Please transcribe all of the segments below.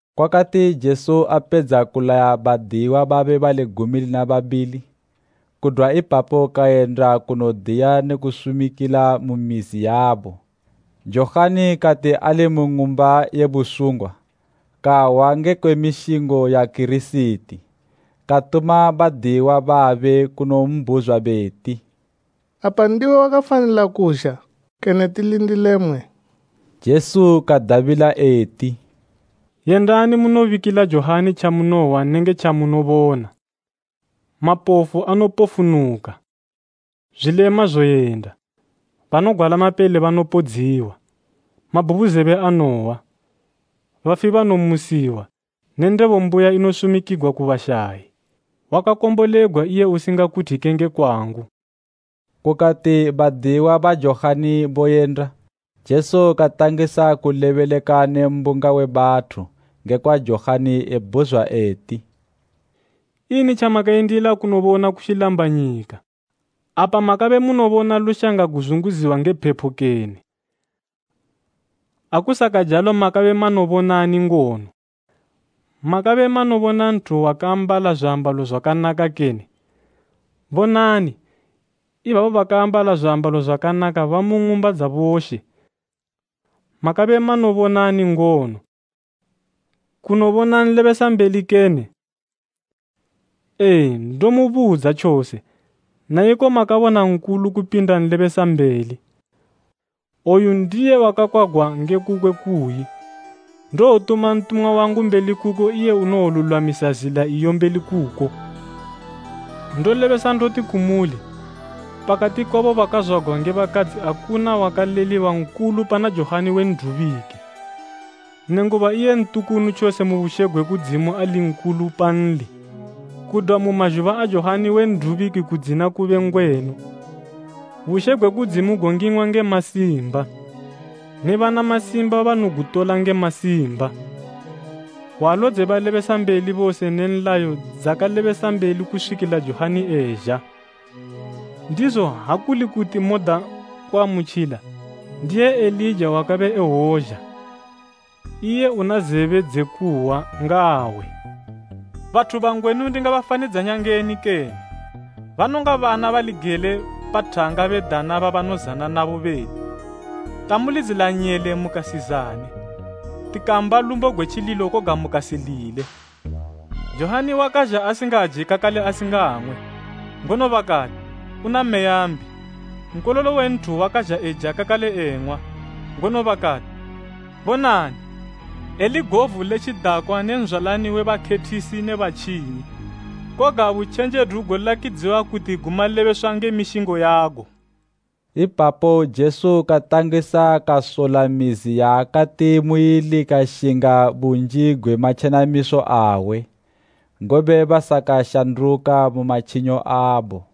Kwakati Jesu apedza kulaya badiyiwa babe bali gumi lina babili, kudwa ipapo kayenda kunodiya ne kunosumikila mu mizi yabo. Johani kati ali mu ng'umba ye busungwa kahwa ngekwe mishingo ya Kirisiti katuma badiyiwa babe kunombhuzwa beti, “Apa ndiwe wakafanila kuzha kene tilindile mmwe?” Jesu kadabila eti, “Yendani munobikila Johani tjamunohwa nenge tjamunobona. Mapofu anopofunuka, zwilema zoyenda, banogwala mapele banopodziwa, mabhubuzebe anohwa, bafi banomusiwa ne ndebo mbuya inosumikigwa ku bashayi. Wakakombolegwa iye usingakuthike nge kwangu.” Kukati badiyiwa ba Johani boyenda Jesu katangisa kulebeleka ne mbunga we bathu ngekwa Johani ebhuzwa eti, “Ini tjamakayendila kunobona ku tjilambanyika? Apa makabe munobona lushanga guzunguziwa nge phepo kene? Akusakajalo makabe manobonani ngono? Makabe manobona nthu wakaambala zwiambalo zwakanaka kene? Bonani, ibabo bakaambala zwiambalo zwakanaka bamu ng'umba dza boshe. Makabe manobonani ngono? Kunobona nlebesambeli kene? Ee, ndomubudza tjose, na iko makabona nkulu kupinda nlebesambeli. Oyu ndiye wakakwagwa nge kukwe kuyi, ‘Ndowotuma ntumwa wangu mbeli kuko iye unowolulwamisa zila iyo mbeli kuko.’ Ndolebesa ndoti kumuli, pakati kwabo bakazwagwa nge bakadzi akuna wakaleliwa nkulu pana Johani we N'dubiki; nenguba iye ntukunu tjose mu bushe gwe kudzimu ali nkulu panli. Kudwa mu mazhuba a Johani we N'dubiki kudzina kube ngwenu, bushe gwe kudzimu gongingwa nge masimba, ne bana masimba banogutola nge masimba. Hwalo dze balebesambeli bose ne nlayo dzakalebesambeli kuswikila Johani ezha. Ndizo ha kuli kuti moda kuamutjila, ndiye Elija wakabe ewozha. Iye una zebe dze kuhwa, ngaahwe. “Bathu bangwenu ndingabafanidzanya ngeni kene? Banonga bana bali gele pa thanga bedana babanozana nabo beti, ‘Tamulidzila nyele mukasizane, tikamba lumbo gwe tjililo koga mukasilile.’ Johani wakazha asingaje kakale asingang'we, ngono bakati, ‘Una meya mbi.’ Nkololo we Nthu wakazha eja kakale eng'wa, ngono bakati, ‘Bonani, eli govu le tjidakwa ne nzwalani we bakhethisi ne batjinyi.’ Koga butjenjedu golakidziwa kuti gu malebeswa nge mishingo yago.” Ipapo Jesu katangisa kasola mizi yaakati muili kashinga bunji gwe matjenamiso awe, ngobe basakashanduka mu matjinyo abo.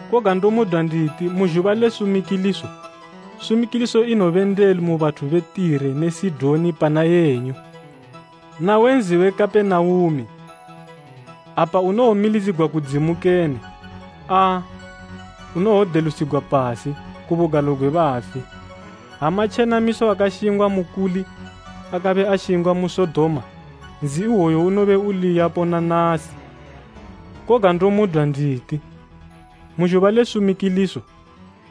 Koga ndomudwa nditi mu zhuba le sumikiliso, sumikiliso inobendelu mu bathu be Tire ne Sidoni pana yenyu. Nawe nzi we Kapenaume, apa unowomilidzigwa kudzimu kene? Aa, unowodelusigwa pasi, ku bugalo gwe bafi. Ha matjenamiso akashingwa mukuli akabe ashingwa mu Sodoma, nzi iwoyu unobe uli yapo na nasi. Koga ndomudwa nditi, mu zhuba le sumikiliso,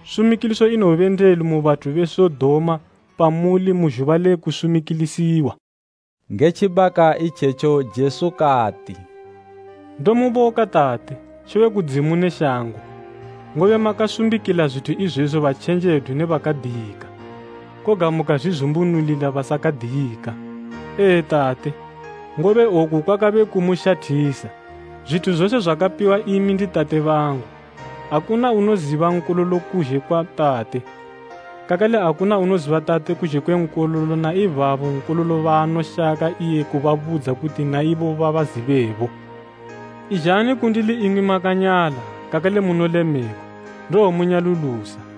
sumikiliso inowobendelu mu bathu be Sodoma pamuli mu zhuba le kusumikilisiwa.” Nge tjibaka itjetjo Jesu kati, “Ndomuboka Tate, She we Kudzimu ne shango, ngobe makasumbikila zwithu izwezwi batjenjedu ne bakadiyika, koga mukazwizumbunulila basakadiyika. Ee, Tate, ngobe oku kwakabe kumushathisa. “Zwithu zose zwakapiwa imi ndi Tate bangu. Akuna unoziba Nkololo kuzhe kwa Tate, kakale akuna unoziba Tate kuzhe kwe Nkololo na ibabo Nkololo baanoshaka iye kubabudza kuti na ibo babazibebo. “Izhani kundili imwi makanyala kakale munolemegwa, ndowomunyalulusa.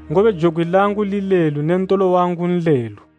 Ngobe jokwi langu lilelu ne ntolo wangu nlelu.”